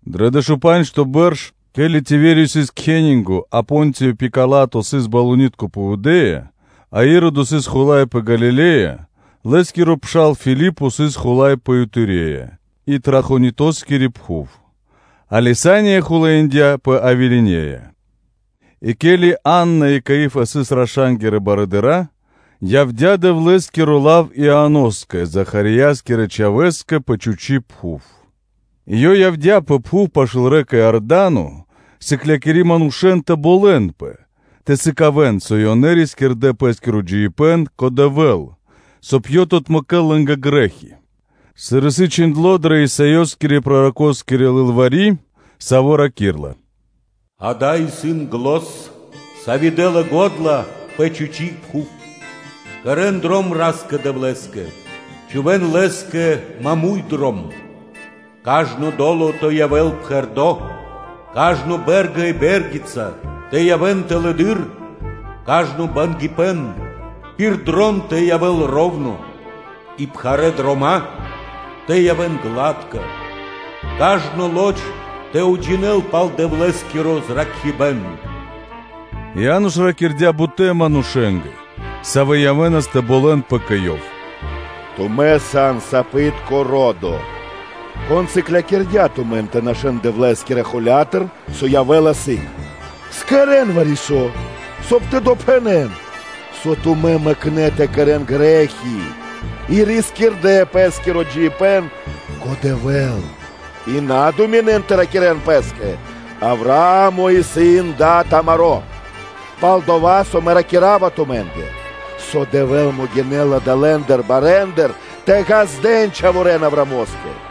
Дро дэшупанджто бэрш, ке́ли Тивериё сыс кхенинго (кесарё), а Понтиё Пила́то сыс балунитко (правителё) пэ Юдэ́я, а Иродо сыс хула́й пэ Галиле́я, Лэ́скиро пшал Филипо сыс хула́й пэ Итурея и Трахонитоскири пхув, а Лисаниё хулаиндя пэ Авилинея; и ке́ли Анна и Каиа́фа сыс раша́нгирэ барыдыра́, явдя́ Дэвлэ́скиро лав Ианоскэ, Захариескирэ чхавэ́скэ пэ чхучи́ пхув. И ёв явдя́ пэ пхув пашы́л рэка (лэнь) Иорда́но, сыклякири манушэ́н тэ болэнпэ тэ сыкавэ́н, со ёнэ рискирдэ́ пэ́скиро джиибэ́н кэ Дэвэ́л, соб (кай) Ёв тэ отмэкэ́л грэ́хи. Сыр исын чхиндло́ дрэ Исаёскирэ-пророкоскири лылвари́, саво́ раки́рла: “Ѓа́да, исын зан, сави́ дэ́ла го́дла пэ чхучи́ пхув: ‘Кэрэ́н дром Ра́скэ-Дэвлэ́скэ, чхувэ́н Лэ́скэ маму́й дром; кажно до́ло тэ явэ́л пхэрдо́, кажно бэ́рга и бэ́ргица тэ явэ́н тэлэды́р, кажно бангипэн тэ явэ́л роўно и бангэ́ дрома́ тэ явэ́н гладка; кажно лоч тэ уджинэл пал Дэвлэ́скиро зракхибэ́н.’” Иа́но ж ракирдя́ бутэ́ манушэ́нгэ, савэ́ явэ́нас тэ болэнпэ кэ ёв: тумэ́ сан сапитко ро́до! Кон сыклякирдя́ тумэн тэ нашэ́н Дэвлэ́скирэ холя́тыр, со явэ́ла сыг? Кэрэ́н вари-со, соб (кай) тэ явэ́л мол, со тумэ́ мэкнэ́ тэ кэрэ́н грэ́хи и рискирдэ́ пэ́скиро джиибэ́н кэ Дэвэ́л, и на думинэн тэ ракирэ́н пэ́скэ: ‘Авраа́мо исын дад амаро́’, пал-дова́ со мэ ракира́ва тумэ́нгэ, со Дэвэ́л могинэ́ла далэндыр барэндыр тэ ґаздэ́н чхаворэ́н Авраамо́скэ;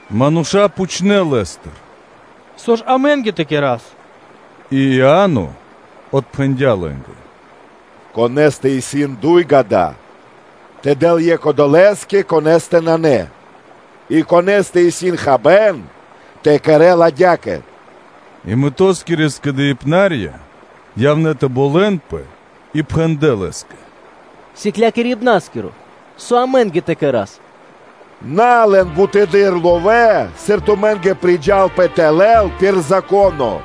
Мануша́ пхучнэ́ Лэ́стыр: “Со ж амэ́нгэ тэ кэра́с?” И Иа́но отпхэндя́ лэ́нгэ: “Конэ́стэ исын дуй ґа́да, тэ дэл екх одолэ́скэ, конэ́стэ нанэ; и конэ́стэ исын хабэ́н, тэ кэрэ́л адя́кэ-паць.” И мытоскирэ скэдыибнарья явнэ́ тэ болэнпэ и пхэндлэ́ Лэ́скэ: “Сыклякирибна́скиро! Со амэ́нгэ тэ кэра́с?” “На лэн бутэды́р ловэ́, сыр тумэ́нгэ сашты́ (домэкно) тэ лэн пир Зако́но.”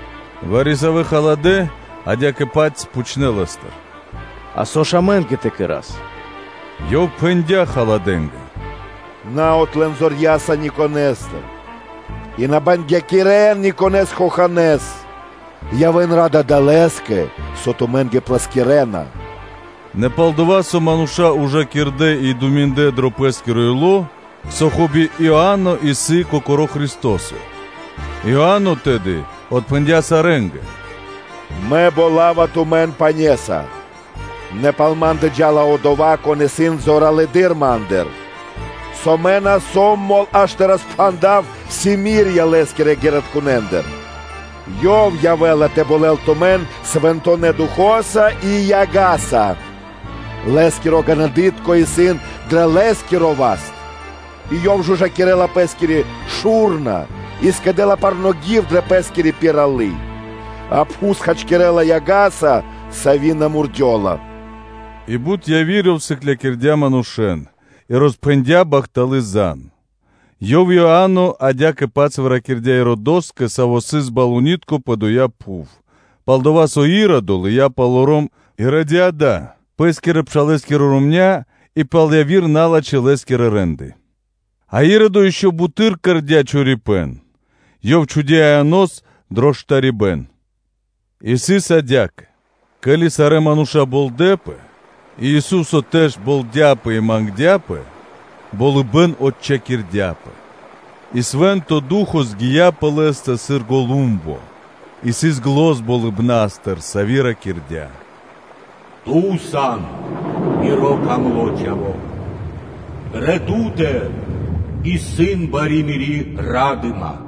Вари-савэ́ халадэ́ адя́кэ-паць пхучнэ́ Лэ́стыр: “А со ж амэ́нгэ тэ кэра́с?” Ёв пхэндя́ халадэнгэ: “На отлэн зорья́са никонэстыр, и на бангякирэн никонэ́с хоханэ́с. Явэ́н ра́да далэскэ, со тумэ́нгэ плэскирэна.” Нэ пал-дова́ со мануша́ ужакирдэ и думиндлэ дро пэ́скиро ило́, со, хоби, Иа́но исын Кокоро́ Христо́со, Иа́но тэды отпхэндя́ сарэ́нгэ: “Мэ болава тумэн пане́са, нэ пал ма́ндэ джа́ла Одова́, Кон исын зоралэды́р ма́ндыр, со мэ на сом мол аж тэ роспхандав симирья Лэ́скирэ ґэритконэндыр, Ёв явэ́ла тэ болэл тумэн Свэнтонэ́ Духо́са и яга́са; Лэ́скиро ґанадытко (лопата) исын дро Лэ́скиро васт, и Ёв жужакирэла Пэ́скири шу́рна и скэдэ́ла парно́ гив дрэ Пэ́скири пиралы́, а пхус хачкирэ́ла яга́са, сави́ на мурдёла.” И бут яви́р ёв сыклякирдя́ манушэ́н, и роспхэндя́ бахталы́ зан (звесь). Ёв, Иа́но, адя́кэ-паць выракирдя Иродоскэ, саво́ сыс балунитко (тетрархо) пэ доя́ пхув, пал-дова́ со Иродо лыя́ палоро́м Иродиада, пэ́скирэ-пшалэ́скирэ ромня́ и пал яви́р налачхэ́ лэ́скирэ рэ́нды; а Иродо ишчо (инкэ́) буты́р кэрдя́ чорипэ́н: ёв чхудя́ Ианос дро штарибэ́н. И сыс адя́кэ: ке́ли сарэ́ мануша́ болдэпэ, и Ису́со тэж болдяпэ и мангдя́пэ, болыбэ́н отчхакирдяпэ, и Свэ́нто Ду́хо (Фа́но) згия пэ Лэ́стэ дро дыцьлы патри́н (о́бразо) сыр голумбо, и сыс зан болыбна́стыр, сави́ ракирдя́: “Ту сан Миро дро́го Чхаво́, дрэ Ту́тэ исын бари Мири́ ра́дыма!”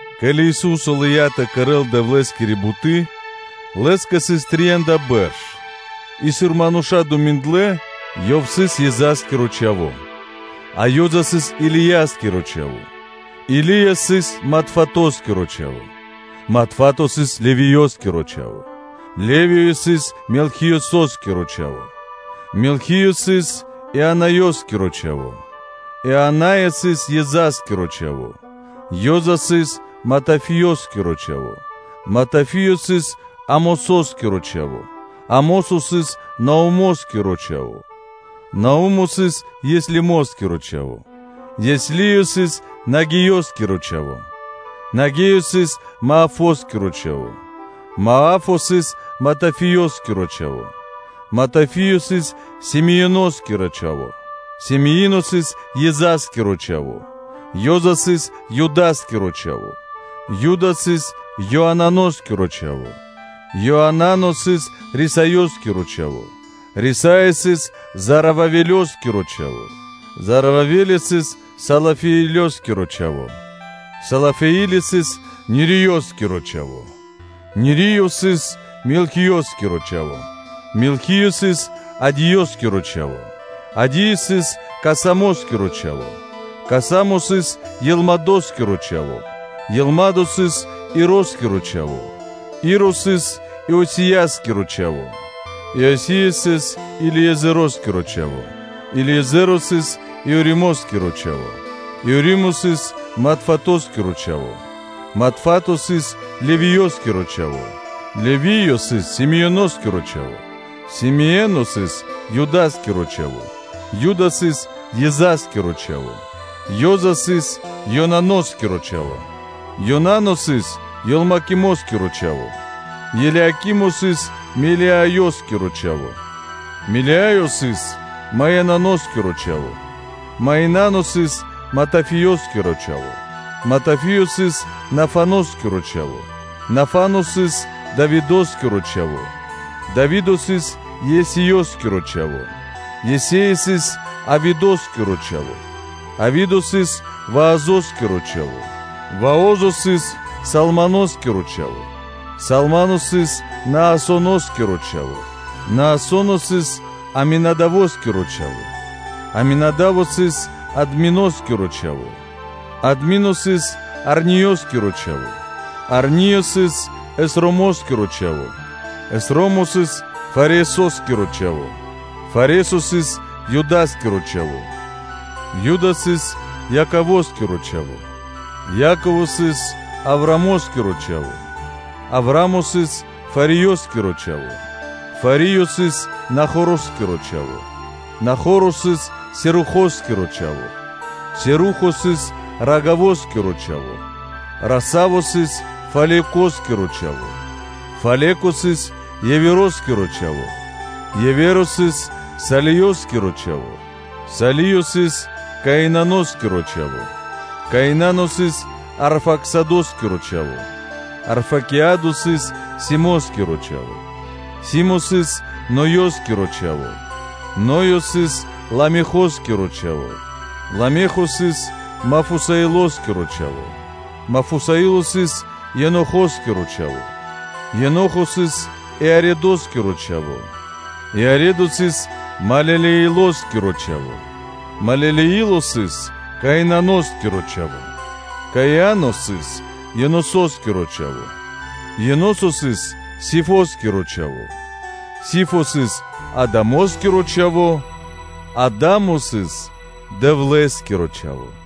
Ке́ли Ису́со лыя́ тэ кэрэ́л Дэвлэ́скири буты́, Лэ́скэ сыс трия́нда бэрш; и, сыр мануша́ думиндлэ, Ёв сыс Ёзаскиро (Иосифоскиро) Чхаво́, а Ёза сыс Илияскиро чхаво́, Или́я сыс Матфатоскиро чхаво́, Матфато сыс Левиёскиро чхаво́, Левиё сыс Мелхиёскиро чхаво́; Мелхиё сыс Ианаёскирэ чхаво́; Ианаё сыс Ёзаскиро чхаво́; Ёза сыс Матафиёскиро чхаво́, Матафиё сыс Амососкиро чхаво́, Амосо сыс Наумоскиро чхаво́; Наумо сыс Еслимоскиро чхаво́; Еслимо сыс Нагеёскиро чхаво́; Нагеё сыс Маафоскиро чхаво́; Маафо сыс Матафиескиро чхаво́; Матафиё сыс Семеиноскиро чхаво́; Семеино сыс Ёзаскиро чхаво́; Ёза сыс Юда́скиро чхаво́; Юда сыс Ёананоскиро чхаво́; Ёанано сыс Рисаёскиро чхаво́; Рисаё сыс Зоровавелёскиро чхаво́; Зоровавелё сыс Салафиилёскиро чхаво́; Салафиилё сыс Нириёскиро чхаво́; Нириё сыс Мелхиёскиро чхаво́; Мелхиё сыс Адиёскиро чхаво́; Адиё сыс Касамоскиро чхаво́; Касамо сыс Елмадоскиро чхаво́; Елмадо сыс Ироскиро чхаво́; Иро сыс Иосия́скиро чхаво́; Иосия сыс Елиезэроскиро чхаво́; Елиезэро сыс Иоримоскиро чхаво́; Иоримо сыс Матфатоскиро чхаво́; Матфато сыс Левиёскиро чхаво́; Левиё сыс Симеоноскиро чхаво́; Симеоно сыс Юда́скиро чхаво́; Юда сыс Ёзаскиро (Иосифоскиро) чхаво́; Ёза сыс Ёнаноскиро чхаво́; Ёнано сыс Елиакимоскиро чхаво́; Елиакимо сыс Мелеаёскиро чхаво́; Мелеаё сыс Маинаноскиро чхаво́; Маинано сыс Матафиёскиро чхаво́; Матафиё сыс Нафаноскиро чхаво́; Нафано сыс Давидо́скиро чхаво́; Дави́до сыс Есеёскиро чхаво́; Есеё сыс Авидо́скиро чхаво́; Авидо сыс Ваозо́скиро чхаво́; Вао́зо сыс Салмоно́скиро чхаво́; Салмано сыс Наасоно́скиро чхаво́; Наасо́но сыс Аминадаво́скиро чхаво́; Аминада́во сыс Админоскиро чхаво́; Админо сыс Арниёскиро чхаво́; Арниё сыс Эсромо́скиро чхаво́; Эсро́мо сыс Фаресо́скиро чхаво́; Фаре́со сыс Юда́скиро чхаво́; Юда сыс Яково́скиро чхаво́; Яково сыс Авраамо́скиро чхаво́; Авраа́мо сыс Фариёскиро чхаво́; Фариё сыс Нахороскиро чхаво́; Нахоро сыс Серухоскиро чхаво́; Серухо сыс Рагавоскиро чхаво́; Рагаво сыс Фалекоскиро чхаво́; Фалеко сыс Евероскиро чхаво́; Еверо сыс Салиёскиро чхаво́; Салиё сыс Каинаноскиро чхаво́; Каинано сыс Арфаксадоскиро чхаво́; Арфакеадо сыс Симоскиро чхаво́; Симо сыс Ноёскиро чхаво́; Ноё сыс Ламехоскиро чхаво́; Ламехо сыс Мафусаилоскиро чхаво́; Мафусаило сыс Енохоскиро чхаво́; Енохо сыс Иаредоскиро чхаво́; Иаредо сыс Малелеилоскиро чхаво́; Малелеило сыс Каиноскиро чхаво́; Каино сыс Енососкиро чхаво́; Еносо сыс Сифоскиро чхаво́; Сифо сыс Адамоскиро чхаво́; Адамо сыс Дэвлэ́скиро чхаво́.